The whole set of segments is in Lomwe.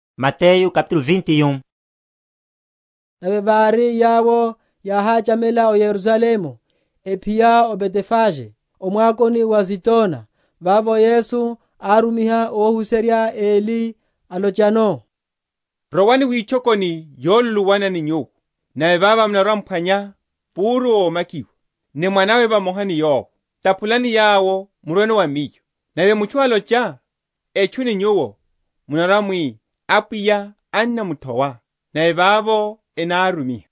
Ovolowa wa Yesu m’Yerusalemu. Nave vári yawo yáháchamela o Yerusalemu, ephiya o Betfage, o mwakoni wa Azitona, vavo Yesu árumiha óhuserya eli, alochano, Rowani witchokoni yoluluwana ni nyuwo, nave vavo munarwa‐m’phwanya púru ómakiwa, ni mwanawe vamoha ni yowo, taphulani yawo, murweno wa Miyo. Nave mutchu alocha etchu ni nyuwo, munarwa‐mwi, Apwiya ennamuthowa, nave vavo enárumiha.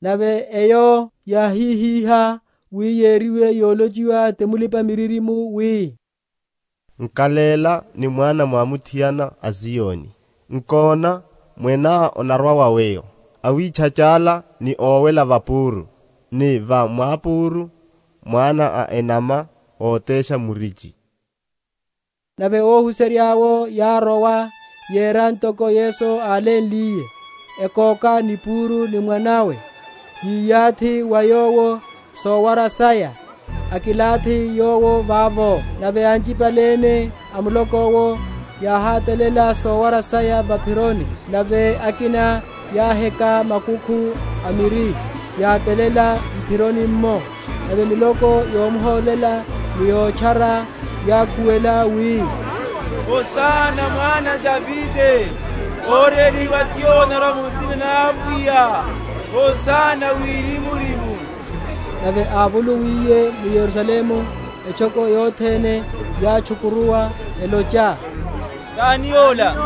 Nave eyo yáhihihá, wi yeriwe yolochiwa ti mulipa‐miririmo wi, Nkaléla ni mwana mwamuthiana a Zioni, Nkona, Mweneá anarwa wa weyo, Awitchachála ni owela va púru, Ni va mwápúru, mwana a enama ótesha murichi. Nave óhuserya’wo yárowa, yera ntoko Yesu álénliye; ekoka ni puru ni mwanawe, yiyathi va yowo sowara saya, akilathi Yowo vavo. Nave anchipale ene a muloko’wo yáhátalela sowara saya va’phironi; nave akina yáheka makukhu a miri, yátalela m’phironi’mmo. Nave miloko yomhólela ni yotchara, yákhuwela, wi, Hosana wa Mwana a Davide! Órélihiwa ti Yowo anórwa mu nsina na Apwiya! Hosana Wirimu‐rimu! Nave ávolowiliye mu Yerusalemu etchoko yothene yátchukuruwa, elocha, Tani ola?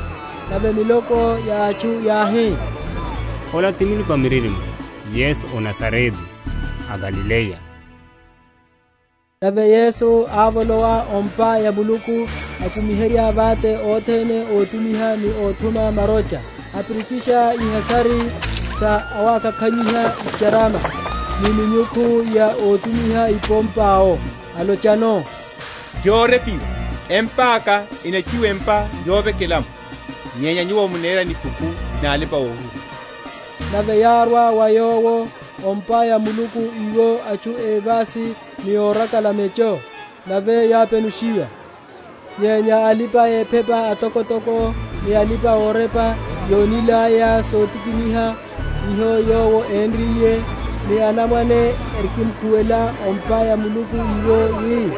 Nave miloko ya atchu yáhi, Ola ti mulipa‐miririmo Yesu a o Nazarete a Galileya. Wélihiwa wa Empa ya Muluku. Nave Yesu ávolowa o’mpa ya Muluku akumiherya vate othene ótumiha ni óthuma marocha, apirikisha ihasari sa awakakhanyiha icharama; ni minyukhu ya ótumiha ipompa’wo; alochano, Yórepiwa, Empa’ka enatchuwiwa empa yovekela’mo; nyenya nyuwo mohera nikhuku na alipa‐ohuhula. Nave yárwa wa Yowo o’mpa ya Muluku iwo atchu évasi ni órakala mecho, nave yápenushiwa. Nyenya alipa‐ephepa atokotoko ni alipa‐orepa, yónilaya sotikiniha hiho Yowo énriye, ni anamwane erikimkhuwela o’mpa ya Muluku iwo wi,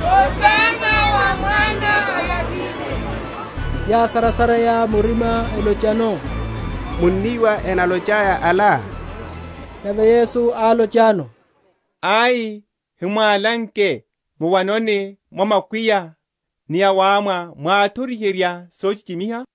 Hosana wa Mwana a Davide; yásarasareya murima, elochano, Munníwa enalochaya ala? Nave Yesu álochano, Ai: hamwálanke, Muwanoni mwa makwiya ni awámwa mwáthoriherya sochichimiha?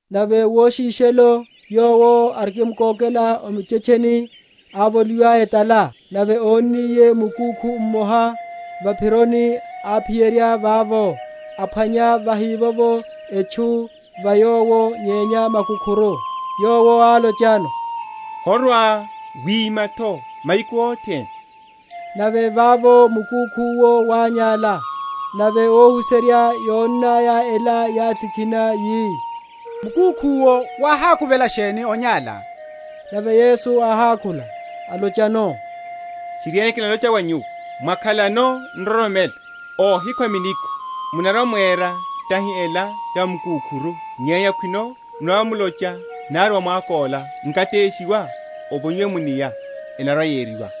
Nave woshishelo, Yowo arikimkokela o muchetcheni, ávoliwa etala. Nave ónniye mukúkhu mmoha va’phironi, áphiyerya vavo, aphwanya vahívovo etchu va yowo nyenya makúkhuru; Yowo álochano, Horwa‐wima’tho mahiku othene. Nave vavo mukúkhu’wo wányála. Nave óhuserya yónnaya ela yátikhina, yi, Mukúkhu’wo wáhákuvela sheni onyála? Nave Yesu áhákhula, alochano, Tchiriene kinalocha wa nyuwo, Mwakhalano nroromelo, ohikhwa minikwa, munarwa‐mwera tahi ela ya va mukúkhuru, nyenya khwino munarwa‐mulocha nari wa mwako’la, Nkateshiwa, ovonyiwe mu’nia, enarwa‐yeriwa.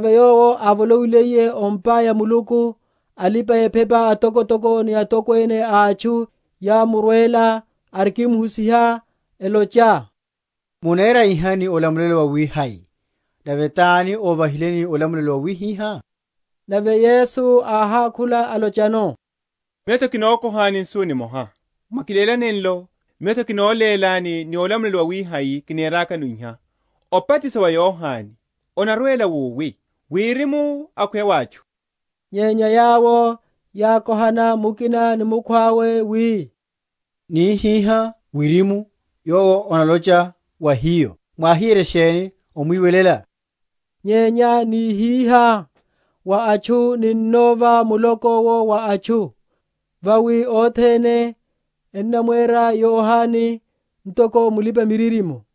Nave Yowo ávolowiliye o’mpa ya Muluku, alipa‐ephepa atokotoko ni atokwene a atchu yámurwela arikimhusiha, elocha, Munera iha ni olamulelo wawihai? nave tani óvahileni olamulelo wawihiha? Nave Yesu áhákhula, alochano, Miyo’tho kinokohani nsu nimoha, mwakiléla nenlo, Miyo’tho kinolélani ni olamulelo wawihai kinerakano iha. Obatiso wa Yohane, onarwela wowi? Wirimu akhweya wa atchu? Nyenya yawo yákohana mukina ni mukhwawe, wi, Nihihá, Wirimu, Yowo analocha wa hiyo, Mwáhiyerye sheni omwiwelela? Nyenya nihihá, Wa atchu, ninnova muloko’wo wa atchu; vawi othene ennamwera Yohane ntoko mulipa‐miririmo.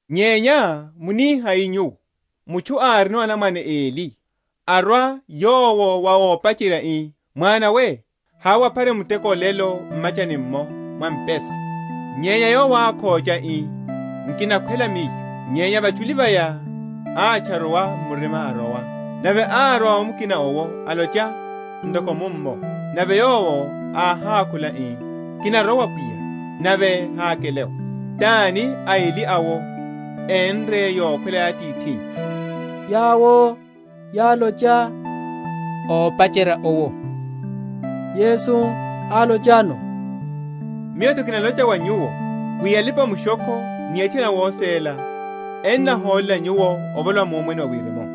Nyenya munihai nyuwo? Mutchu árino anamwane eli; arwa yowo wa ópacherya ii, mwana we, hawe waphare muteko olelo m’machani’mmo mwa mpesa. Nyenya yowo ákhocha, ii, Nkinakhwela miyo: nyenya vachuli vaya átcharuwa murima, arowa. Nave árwa wa mukina owo, alocha ntoko mummo. Nave yowo áhákhula, ii, Kinarowa pwiya: nave hákele’wo. Tani a eli awo énre yokhwela ya atithinnya? Yawo yálocha, Ópacherya owo. Yesu álochano, Miyo’tho kinalocha wa nyuwo, wi alipa‐mushokho ni athiana awóséla ennaholela nyuwo, ovolowa mu Omwene wa Wirimu.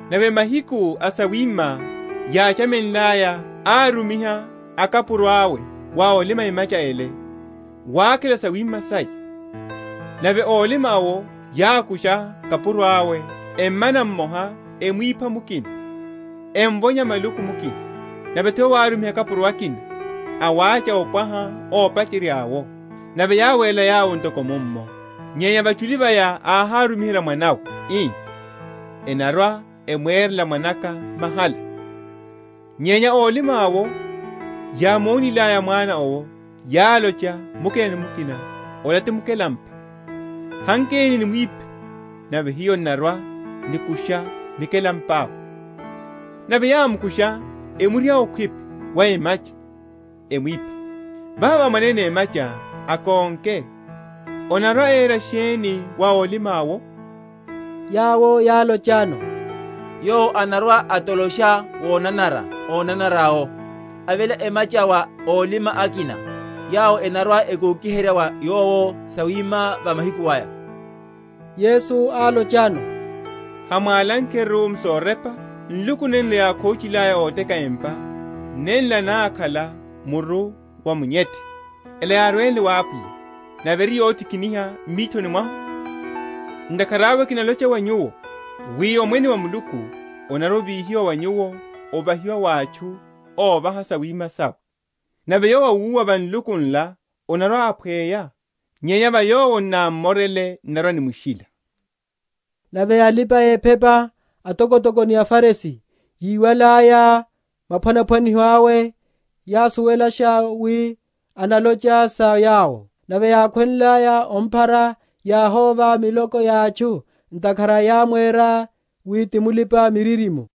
Nave mahiku a sawima yáchamenlaya árumiha akapuro awe wa ólima emacha’le, wakhela sawima saya. Nave ólima’wo yákusha akapuro awe, emmana mmoha, emwipha mukina, emvonya maluku mukina. Nave’tho yowo árumiha akapuro akina, awácha opwaha ópacherya’wo; nave yáwerela yawo ntoko mummo. Nyenya vachuli vaya áhárumihela mwanawe, ii, Enarwa‐emwerela mwanaka mahala. Nyenya ólima’wo yámonilaya mwana owo, yálocha mukina ni mukina, Ola ti mukelampa, hankeni, nimwiphe, nave hiyo n’narwa‐nikusha mikelampa’we. Nave yámkusha, emriha okhwipi wa emacha, emwipha. Vano mwanene emacha akonke, anarwa‐era sheni wa ólima’wo? Yawo yálochano, Yowo anarwa‐atolosha wonanara ónanara yawo, aveléla emacha wa ólima akina, yawo enarwa‐ekokiherya wa yowo sawima va mahiku aya. Yesu álochano, Hamwálankeru m’sorepa, Nluku nenlo yákhochilaya óteka empa Nenla nákhala muru wa munyethe: Ela yárwenle wa Apwiya, Nave eri yotikiniha m’mithoni mwahu? Ntakhara awe kinalocha wa nyuwo, wi Omwene wa Muluku onarwa‐ovíhiwa wa nyuwo, ovahiwa wa atchu óvaha sawima sawe. Nave yowo awúwa va nluku nla anarwa‐aphweya; nyenya va yowo n’nam’morele, n’narwa‐nimushila. Nave alipa‐ephepa atokotoko ni aFarisi, yíwalaya maphwanaphwaniho awe, yásuwelasha wi analocha sa yawo. Nave yákhwenlaya omphara, yáhóva miloko ya atchu, ntakhara yámwera wi ti mulipa‐miririmo.